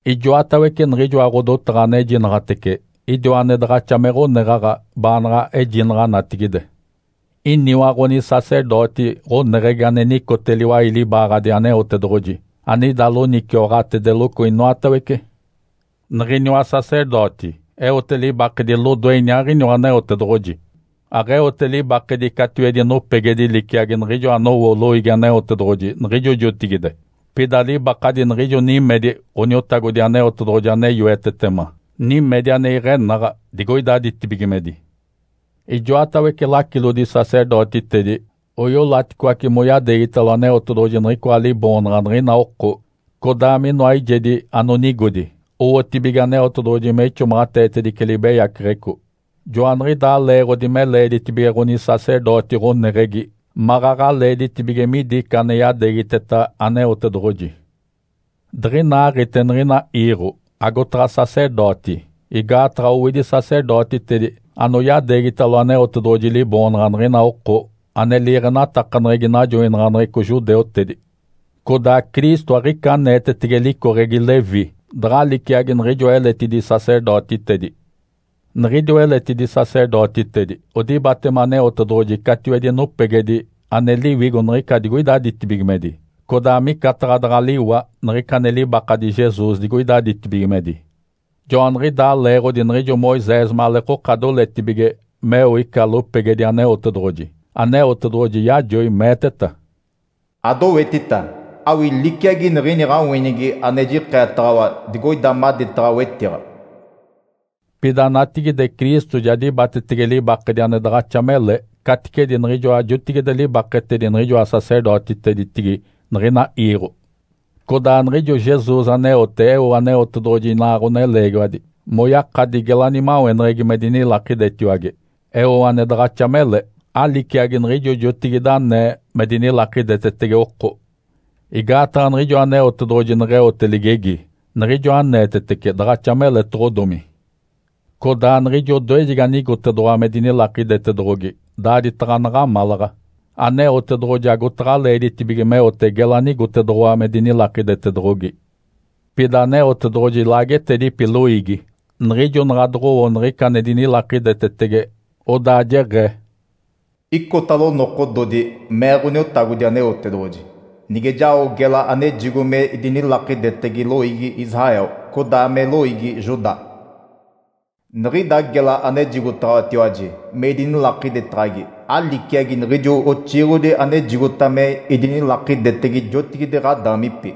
Ijoatawece niɡ̶ijoa ɡ̶odotaɡ̶a anejinaɡ̶atece, idiwa ane daɡ̶axa me ɡ̶oneɡ̶aɡ̶a baanaɡ̶a ejinaɡ̶a natigide. Iniwa ɡ̶onisacerdoti ɡ̶oneɡ̶egi ane nicote liwai libaaɡ̶adi Aneotedoɡ̶oji anida loniciwaɡ̶atedeloco inoatawece. Niɡ̶iniwa sacerdoti eote libakedi lodoe iniaaɡ̶iniwa Aneotedoɡ̶oji. Aɡ̶eote libakedi catiwedi nopegedi liciagi niɡ̶ijo anowo loiigi Aneotedoɡ̶oji niɡ̶ijo jotigide, pida libakadi niɡ̶ijo nimedi Ǥoniotagodi Aneotedoɡ̶oji ane yoetetema, nimedi ane iɡ̶enaɡ̶a, digoida ditibigimedi. Ijoatawece lacilodi-sacerdotitedi oiolaticoace moyadeegitalo Aneotedoɡ̶oji niɡ̶icoa liboonaɡ̶a niɡ̶ina oko, codaa minoa eijedi anonigodi, owotibige Aneotedoɡ̶oji me ixomaɡ̶ateetedice libeyaceɡ̶eco. Joaniɡ̶idaa leeɡ̶odi me leeditibige ɡ̶onisacerdoti ɡ̶oneɡ̶egi maɡ̶aɡ̶a leeditibige midi ica ane yadeegiteta Aneotedoɡ̶oji. Diɡ̶inaaɡ̶ite niɡ̶ina iiɡ̶o, agotaɡ̶a sacerdoti, igaataɡ̶a owidi sacerdotitedi anoyadeegitalo Aneotedoɡ̶oji liboonaɡ̶a niɡ̶ijo oko, ane liiɡ̶enatakaneɡ̶egi najoinaɡ̶aneɡ̶eco judeutedi. Codaa Cristo aɡ̶ica aneetetege licoɡ̶egi Levi daɡ̶a liciagi niɡ̶ijoa eletidi sacerdotitedi. Niɡ̶idiwa eletidi sacerdotitedi odibatema Aneotedoɡ̶oji catiwedi nopegedi ane liwigo niɡ̶ica digoida ditibigimedi, codaa micataɡ̶a daɡ̶a liwa niɡ̶ica ane libakadi Jesus digoida ditibigimedi. Joaniɡ̶idaa leeɡ̶odi niɡ̶ijo Moisés maleekoka doletibige meo ica lopegedi Aneotedoɡ̶oji, Aneotedoɡ̶oji yajoi meeteta, “Adowetita, awii liciagi niɡ̶ini ɡ̶awinigi ane jikeetaɡ̶awa digoida maditaɡ̶a wetiɡ̶a.” Pida natigide Cristo ja dibatetege libakedi ane daɡ̶axa mele caticedi niɡ̶ijoa jotigide libaketedi niɡ̶ijoa sacerdotiteditigi niɡ̶ina iiɡ̶o. Codaa niɡ̶ijo Jesus aneote eo Aneotedoɡ̶oji inaa ɡ̶oneleegiwadi moyakadi gela nimaweneɡ̶egi me dinilakidetiwage, eo ane daɡ̶axa mele, aliciagi niɡ̶ijo jotigide anee me dinilakidetetege oko. Igaataɡ̶a niɡ̶ijo Aneotedoɡ̶oji neɡ̶eote ligegi, niɡ̶ijo aneetetece daɡ̶axa meletoɡ̶odomi. Codaa niɡ̶ijo odoejegi anigotedoɡ̶owa me dinilakidetedoɡ̶ogi daaditaɡ̶a naɡ̶amalaɡ̶a, Aneotedoɡ̶oji agotaɡ̶a leeditibige meote gela anigotedoɡ̶owa me dinilakidetedoɡ̶ogi. Pida Aneotedoɡ̶oji laagetedipi loiigi, niɡ̶ijo naɡ̶a doɡ̶owo niɡ̶ica ane dinilakidetetege, odaa jeɡ̶ee, “‘Icotalo nokododi’, mee Ǥoniotagodi Aneotedoɡ̶oji, ‘Nige jao gela anejigo me idinilakidetege loiigi Israel, codaa me loiigi Judá. Niɡ̶ida gela anejigotaɡ̶awatiwaji me idinilakidetaɡ̶agi aliciagi niɡ̶ijo oxiiɡ̶odi anejigota me idinilakidetege jotigide ɡ̶adaamipi,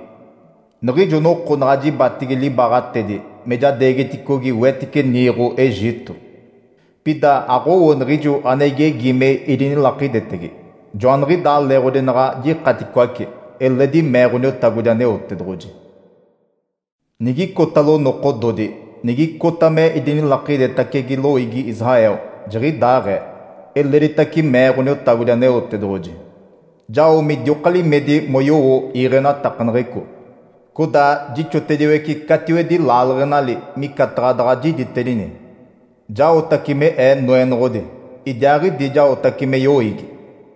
niɡ̶ijo noko naɡ̶a jibatigi libaaɡ̶atedi me jadeegiticogi wetice niiɡ̶o Egito. Pida aɡ̶owo niɡ̶ijo ane igegi me idinilakidetege, joaniɡ̶idaa leeɡ̶odi naɡ̶a jikaticoace’, eledi mee Ǥoniotagodi Aneotedoɡ̶oji. ‘Nigicotalo nokododi, nigicota me idinilakidetacege loiigi Israel, jiɡ̶idaaɡ̶ee’, eleditace mee Ǥoniotagodi Aneotedoɡ̶oji. ‘Jao midioka limedi moyowo iiɡ̶enatakaneɡ̶eco. Codaa jixotediwece catiwedi laaleɡ̶enali micataɡ̶a daɡ̶a jiditedini. Jaotace me Ee Noenoɡ̶odi, idiaaɡ̶idi jaotace me yoiigi.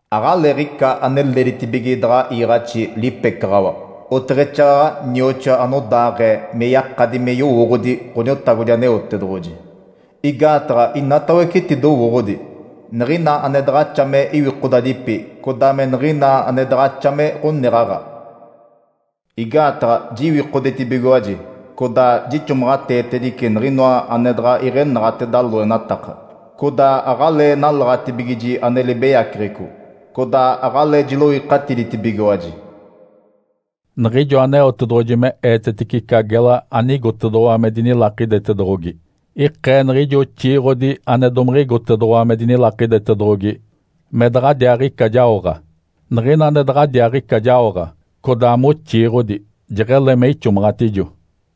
Aɡ̶aleeɡ̶ica ane leeditibige daɡ̶a iiɡ̶axi lipecaɡ̶awa oteɡ̶exaaɡ̶aɡ̶a nioxoa anodaaɡ̶ee me yakadi me yowooɡ̶odi Ǥoniotagodi Aneotedoɡ̶oji, igaataɡ̶a inatawece etidowooɡ̶odi, niɡ̶ina ane daɡ̶axa me iwikodadipi codaa me niɡ̶ina ane daɡ̶axa me ɡ̶oneɡ̶aɡ̶a. Igaataɡ̶a jiwikodetibigiwaji codaa jixomaɡ̶ateetedice niɡ̶inoa ane daɡ̶a iɡ̶enaɡ̶ateda loenataka, codaa aɡ̶alee nalaɡ̶atibigiji ane libeyaceɡ̶eco, codaa aɡ̶alee jiloikatiditibigiwaji.’” Niɡ̶ijo Aneotedoɡ̶oji me eetetece ica gela anigotedoɡ̶owa me dinilakidetedoɡ̶ogi, ikee niɡ̶ijo oxiiɡ̶odi ane domiɡ̶igotedoɡ̶owa me dinilakidetedoɡ̶ogi me daɡ̶adiaaɡ̶ica jaoɡ̶a. Niɡ̶ina ane daɡ̶adiaaɡ̶ica jaoɡ̶a, codaa moxiiɡ̶odi, jeɡ̶ele me ixomaɡ̶atijo.